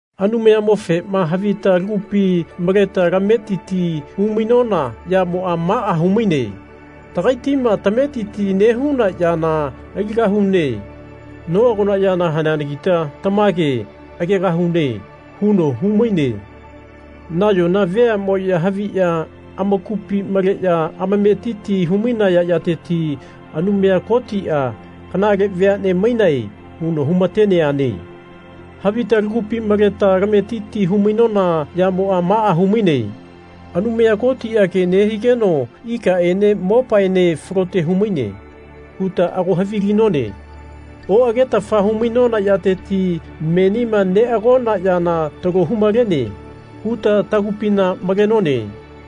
Anumayamofema havita lagupi maleta lametiti hu-mainona yamoa maa humaine Tagaitima tametiti nehuna yana aligahune. Noagona yana haneanagita tamage agegahune. huno humaine. Nayona veamoya haviya amakupi maleya amametiti hu-mainayateti Anumaya Kotia Kanale veane mainae. huno humateneane. Havita lagupi maleta lametiti hu-mainona yamoa maa humaine Anumaya Kotia ke nehigeno ikaene mopaene falote humaine. huta ago havilinone. Oagetafa hu-mainona yateti menima neagona yana talo humalene huta tagupina malenone.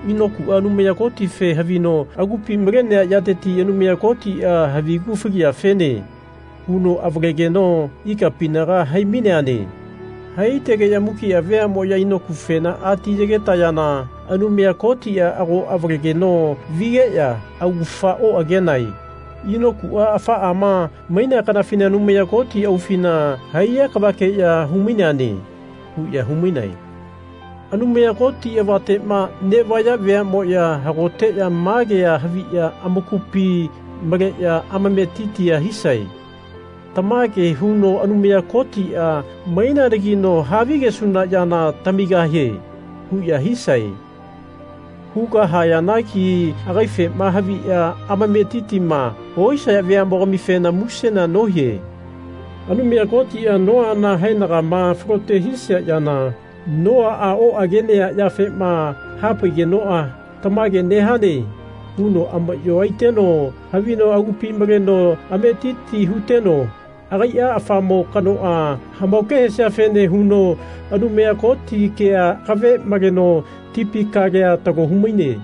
Inokua Anumaya Kotife havino agupi malenea yateti Anumaya Kotia Havigu faliyafene. huno avalegeno ikapinaga hai-maineane. Haitegeya mukia veamoya Inokufena atiyegetayana Anumaya Kotia ago avalegeno vigeya augafa oagenae. Inokua afaama mainea kanafina Anumaya Koti aufina haiya kavakeya hu-maineane. huya humainae. Anumaya Koti avatema nevaya veamoya hagoteya ma kea haviya amakupi maleya amametitia hisae Tamage huno Anumaya Kotia maineanagino havigesuna yana tamigahie. huya hisae. Hugahayanagi agaifema haviya amametitima ohisaya veamogamifena musena nohie. Anumaya Kotia Noana haenagama falote hisia yana, Noaa oagenea yafema hapaigenoa Tamage nehane. huno amayo aiteno havino agupi maleno ametiti huteno agaia afamo kanoa hamaoke hesiafene huno Anumaya Koti kea akave maleno tipi kalea talo humaine.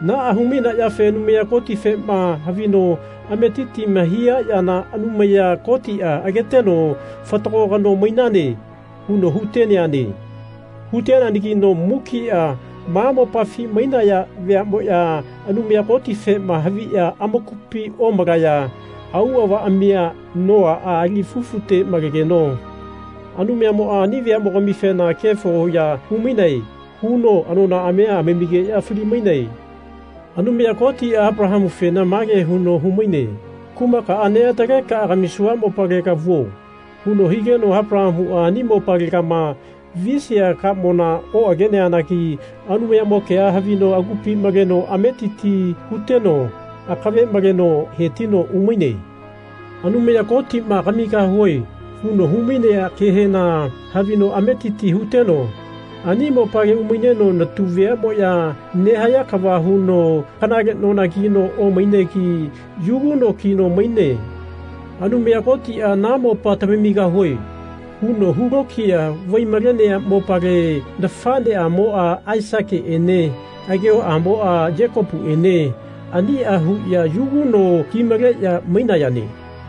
Naa hu-maineafe Anumaya Kotifema havino ametitima hia yana Anumaya Kotia ageteno Fatago kano mainane. huno huteneane. Huteneanagino mukia ma mopafi mainaya veamoya Anumayamofema haviya amakupi omalaya auavaamia Noaa ali fufute maletegeno Anumayamoa ani veamogamifena Kefo ya humainae. huno anonaamia amamigeya fali-maine. Anumaya Kotia Apalahamufena mage huno humaine Kumakaa neataleka kamisua mopalega vuo. huno higeno Apalahamua ani mopalegama visia kamona oageneanagi Anumayamo kea havino agupi maleno ametiti huteno akave maleno hetino umaine. Anumaya Kotima Kamigahue. huno humainea kehena havino ametiti huteno ani mopale umaineno natu veamoya nehaya kava huno kanale nona kino omainegi yugu no kino maine. Anumaya Kotia Na mopa tamamigahue. huno hulokiya vai-malenea mopale nafaneamoa Aisakiene agehoamoa Yekopuene ania huya yugu no kimaleya mainayane.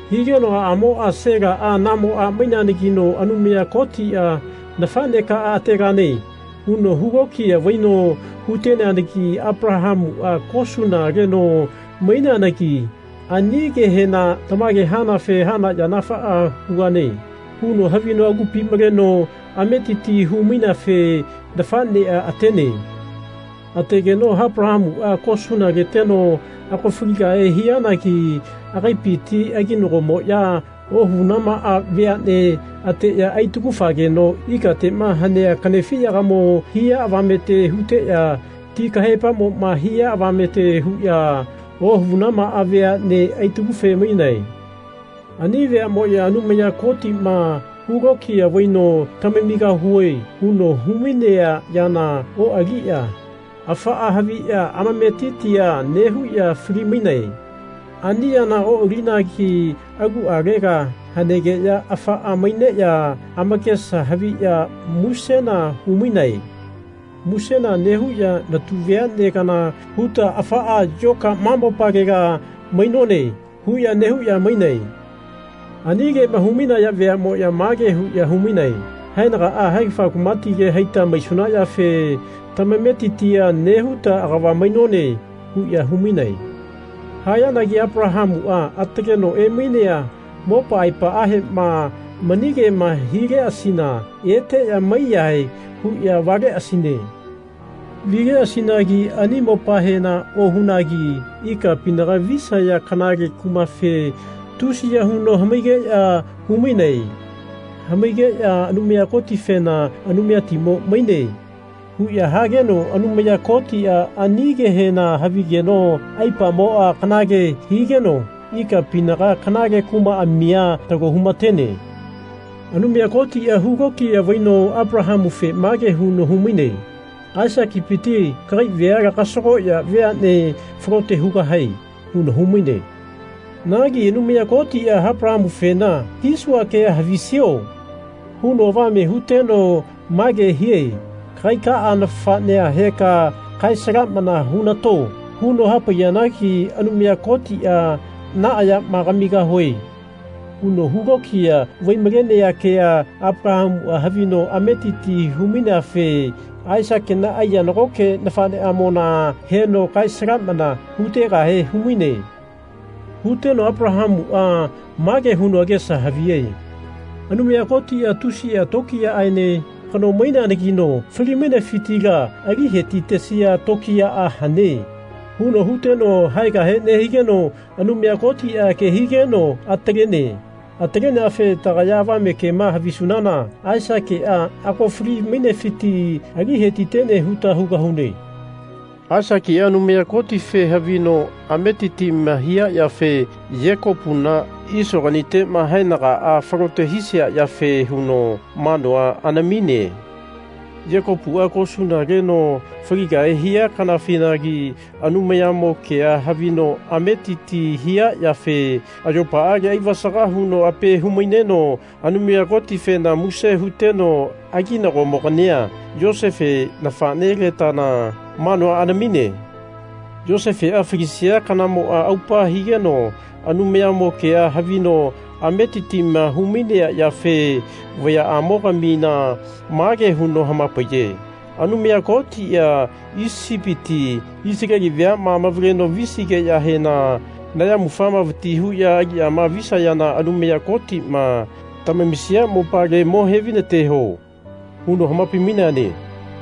Higeno aamoa Salae namo a maineanagino Anumaya Kotia Nafanekaa ategane. huno hu lokiya vaino huteanagi Apalahamua kosuna leno maineanagi ani kehena Tamage hanafe hana yana afaa hugane. huno havino agupi maleno ametiti hu-maineafe nafanea atene. Ategeno Apalahamua kosuna leteno ago faligahe hianagi agaipiti aginagomoya ohavunamaa veane ateya aitagu-fageno ikatema hanea kanefiyagamo hia avamete huteya ti kahaepamoma hia avamete huya ohavunamaa veane aitagufe-mainae. Ani veamoya Anumaya Kotima hu lokiya vaino Tamamigahue. huno humainea yana oaliya afaa haviya amametitia nehuya fali-mainae. Ani yana oalinagi alualega hanegeya afaa maineya amakesa haviya musena humainae. Musena nehuya Natu veane kana huta afaa yoka ma mopalela mainone. huya nehuya mainae. Ani kema humainaya veamoya mage huya humainae Haenagaa haegafa kumatile haita maisuna yafe tamametitia nehuta agava mainone. huya humainae. Hayanagi Apalahamuma ataleno emainea mopa aepaahema mani kema hileasina eteya maiyahae huya valeasine. Valeasinagi ani mopahena ohunagi ikapinaga visaya kanale kumafe tusiya huno hamaigeya humaine. Hamaigeya Anumaya Kotifena Anumayatimo maine. huya hageno Anumaya Kotia ani kehena havigeno aipamoa kanale higeno ikapinaga kanale kumaamia talo humatene. Anumaya Kotia hulokiya vaino Apalahamufe mage huno humaine Aisakipiti kagai veala kasagoya veane falote hugahae. huno humaine. Nagi Anumaya Kotia Apalahamufena Hisua kea havisio? huno avame huteno mage hie Kagaikaa nafanea heka kae-salamana hunato. huno hapaiyanagi Anumaya Kotia Naa yama kamigahue. huno hu lokiya vai-malenea kea Apalahamua havino ametiti hu-maineafe Aisakina aiya nagoke nafaneamona heno kae-salamana hutegahe humaine. Huteno Apalahamua mage huno agesa havie Anumaya Kotia tusia tokiyaaene kano maineanagino fali-mainesifitila ali hetitesia tokiyaa hane. huno huteno haegahe nehigeno Anumaya Kotia ke higeno atalene. Ataleneafe tagaya avame kema havisunana Aisakia ago fali-mainefiti ali hetitene huta hugahune. Aisakia Anumaya Kotife havino ametitima hia yafe Yekopugani Isoganitema haenagaa falote hisia yafe huno manua anamine. Yekopua kosuna leno faligahe hia kanafinagi Anumayamo kea havino ametiti hia yafe ayopaale aivasaga huno ape hu-maineno Anumaya Kotifena muse huteno aginagomogania, Yosefe nafanelatana, manua anamine. Yosefea falisia kanamoa aupa higeno Anumayamo kea havino ametitima humainea yafe vayaamo-gamina mage huno hamapaiye Anumaya Kotia Isipiti Isaleli veama amavaleno visigeyahena nayamufama vati huya aliyama visayana Anumaya Kotima tamamisia mopale mo hevainateho. huno hamapai-maineane.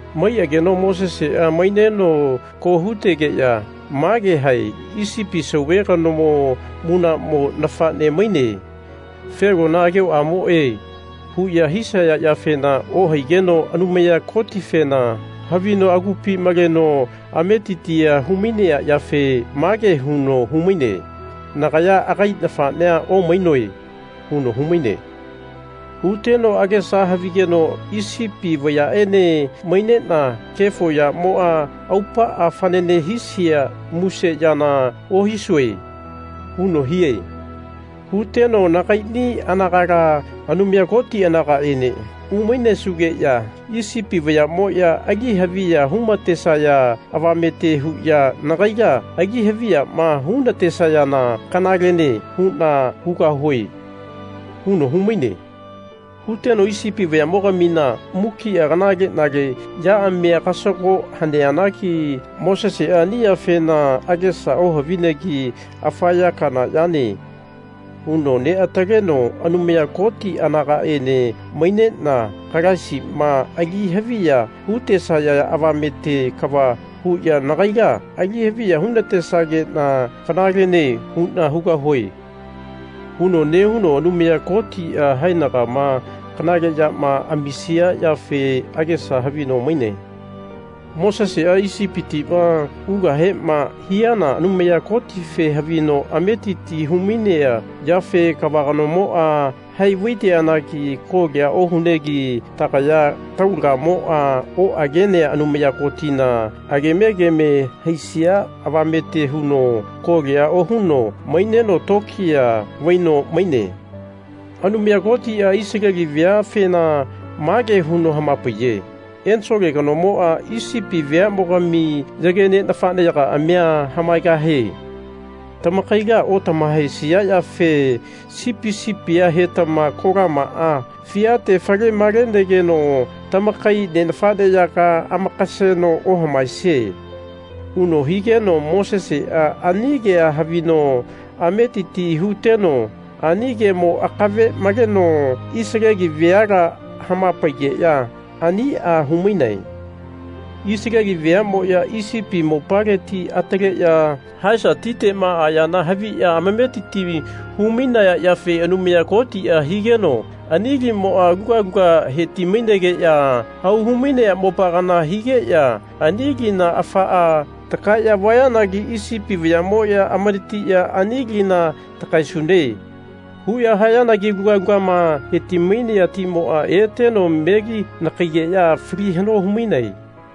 Maiageno Mosesea maineno ko hutegeya mage hae Isipi Sauve kanomo munamo nafane maine. Felona agehoamoe. huya hisaya yafena ohaigeno Anumaya Kotifena havino agupi maleno ametitia humainea yafe mage huno humaine Nagaya agai nafanea omainoe. huno humaine. Huteno agesa havigeno Isipi vayaene mainena kefo yamoa aupaa fanane hisia muse yana ohisue. huno hie. Huteno Nagaini anagala, Anumaya Koti anagaene umainesugeya Isipi vayamoya ali haviya humatesaya avamete huya nagaila ali haviyama hunatesayana kanalene huna hugahue. huno humaine. Huteno Isipi vayamogamina mukia kanale-nale yaamia kasago haneanagi Mosesea ani yafena agesa ohavinegi Afa ya kana yane. huno neataleno Anumaya Koti anagaene mainena Kalaisima ali haviya hutesaya avamete kava huya nagaila ali haviya hu-natesagena kanalene huna hugahue. huno nehuno Anumaya Kotia haenagama kanale yama amisia yafe agesa havino maine. Mosesea Isipitima ugahema hiana Anumaya Kotife havino ametiti humainea yafe kava kanomoa hai vaiteanagi kolia ohunegi tagaya taulagamoa oagenea Anumaya Kotina agemegeme haisia avamete huno kolia ohuno maineno tokiya vaino maine. Anumaya Kotia Isaleli veafena mage huno hamapaiye Ensole kanomoa Isipi veamogami yage ne nafaneyagaamia hamaegahie. Tamakaila otamahaesia yafe sipi sipia hetama kolamaa fiate fale-malenegeno tamakai ne nafaneyaga amakaseno ohamaesie. huno higeno Mosesea ani kea havino ametiti huteno ani kemo akave maleno Isaleli veala hamapaigeya ania humainae. Isaleli veamoya Isipi mopaleti ataleya Haesa titema ayana haviya amametiti hu-mainaya yafe Anumaya Kotia higeno ani limoa aluga luga heti-mainegeya hau hu-mainea mopa kana higeya ani lina afaa takaeya vayanagi Isipi vayamoya amanatiya Ani lina takaesune. huya hayanagi aluga lugama heti-mainea timoa eteno meli-nakaigeya fali hano humainae.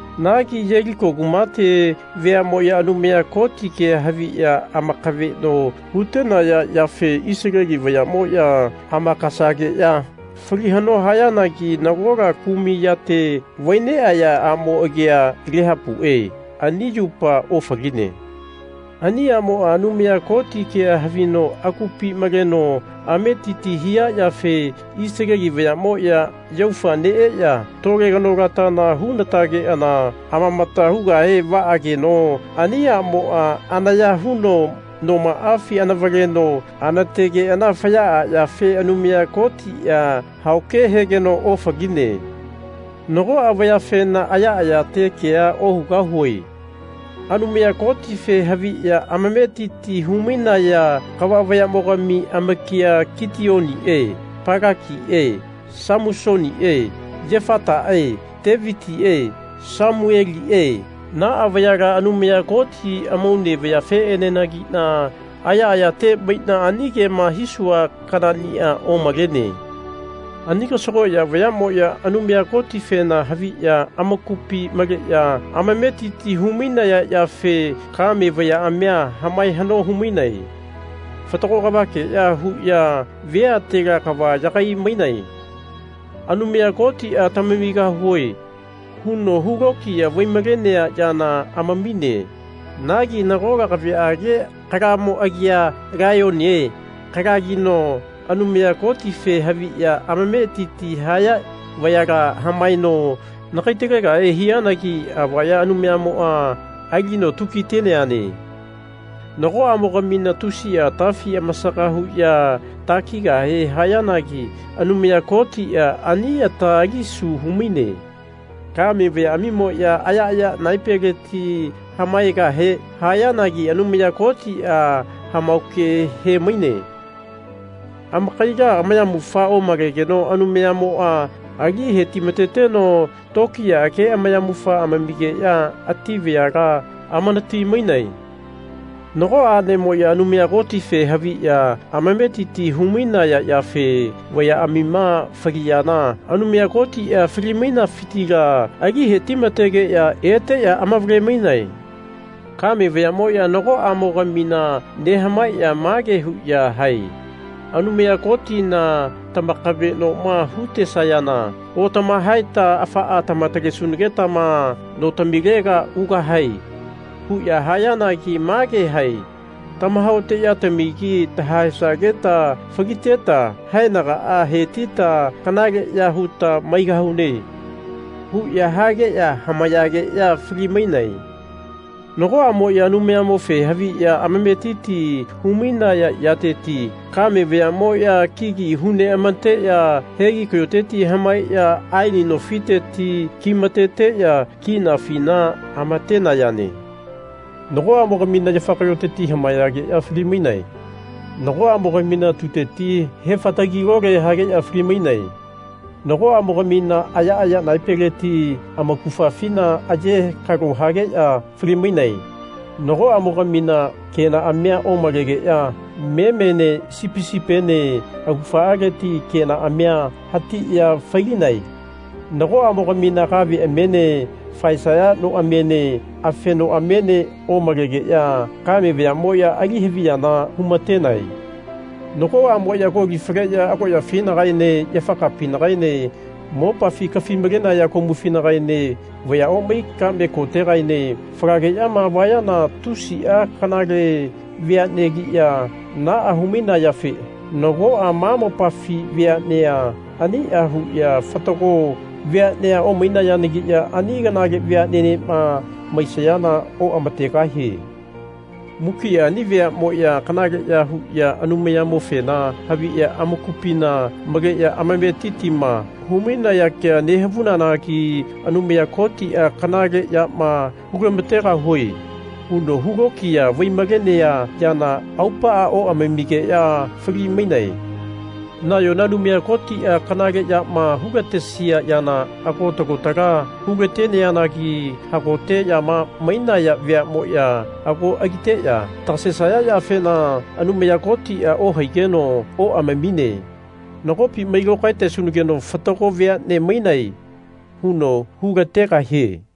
Nagi Yeliko kumate veamoya Anumaya Koti kea haviya amakaveno hutenaya yafe Isaleli vayamoya amakasageya fali hano hayanagi nagola kumai yate vai neaya amo agia Lehapue ani yupa ofaline. Ani amoa Anumaya Koti kea havino agupi maleno ametiti hia yafe Isaleli vayamoya yaufa neeya tole kanolatana hunatageana amamata hugahe vaageno ani amoa anaya huno nomaafi anavaleno anategeana fayaa yafe Anumaya Kotia haoke hegeno ofaline. Nagoa vayafena ayaayate kea ohugahue. Anumaya Kotife haviya amametiti humainaya kava vayamogami amakia Kiteonie Palakie Samusonie Yefatae Tevitie Samuelie naa vayala Anumaya Koti amaune vayafeenenagina ayaayate maina ani kema hisua kanania omalene. Ani kasagoya vayamoya Anumaya Kotifena haviya amakupi maleya ametiti humainaya yafe kame vayaamia hamae hano humainae. Fatago kavakeya huya veatela kava yagai-mainae. Anumaya Kotia Tamamigahue. huno hu lokiya vai-malenea yana amamine. Nagi nagola kaveage afumo agia Laiyonie afugino Anumaya Kotife haviya amametiti haya vayala hamaeno nakai-talegahe hianagi avaya Anumayamoa alino tukiteneane. Nagoamogamina tusia atafi amasaga huya takigahe hayanagi Anumaya Kotia ani ata alisu humaine. Kame vayaamimoya ayaaya naepeleti hamaegahe hayanagi Anumaya Kotia hamaoke hemaine. Amakaila amayamufa omalegeno Anumayamoa ali hetimateteno tokiyaage amayamufa amamigeya ati vayala amanati-mainae. Nagoa anemoya Anumayamofe haviya amametiti humainaya yafe vayaamima faliyana Anumaya Kotia fali-mainafitila ali hetimategeya eteya amavale-mainae. Kame vayamoya nagoamo-gamina nehamaeya mage huya hae Anumaya Kotina tamakavenoma hutesayana otamahaeta afaa tama-talesunagetama notamilega ugahae. huya hayanagi mage hae Tamahaoteyatamigi tahaesageta faliteta haenaga hetita kanaleya huta maigahune. huya hageya hamayageya fali-mainae. Nagoamoya Anumayamofe haviya ametiti humainaya yateti kame vayamoya kigi hu neamateya hegi kayoteti hamaeya aeni nofiteti kimateteya kinafina amatenayane. Nagoamogamina yafa kayoteti hamayageya fali-mainae. Nagoamogamina tuteti hefatagi-lole hageya fali-mainae. Nagoamogamina ayaaya naepeleti amaugafafina aye kalo hageya fali-mainae. Nagoamogamina kenaamia omalegeya memene sipi sipiene augafaleti kenaamia hatiya fai-linae. Nagoamogamina kaveamiene faesaya noamiene afenoamiene omalegeya kame vayamoya ali haviyana humatenae. Nagoamoya koli faleya agoyafinagaene yafa kapinagaene mopafi kafi-malenaya komufinagaene vaya omai kame kotegaene falageyama vayana tusia kanale veanegiya naa humainayafe nagoa ma mopafi veanea ania huya fatago veanea omainayanagiya ani kanale veanenema maisayana oamategahie. Mukia ani veamoya kanale ya huya Anumayamofena haviya amakupina maleya amametitima humainaya kea nehavunanagi Anumaya Kotia Kanale yama hulamategahue. huno hu lokiya vai-malenea yana aupaa oamamigeya fali-mainae. Nayona Anumaya Kotia kanale yama hulatesia yana ago talo tala hulateneanagi hagoteyama mainaya veamoya ago aliteya tagasesaya yafena Anumaya Kotia ohaigeno oamamine. Nagopi mai lokaetesunageno Fatago veane mainae. huno hulategahie.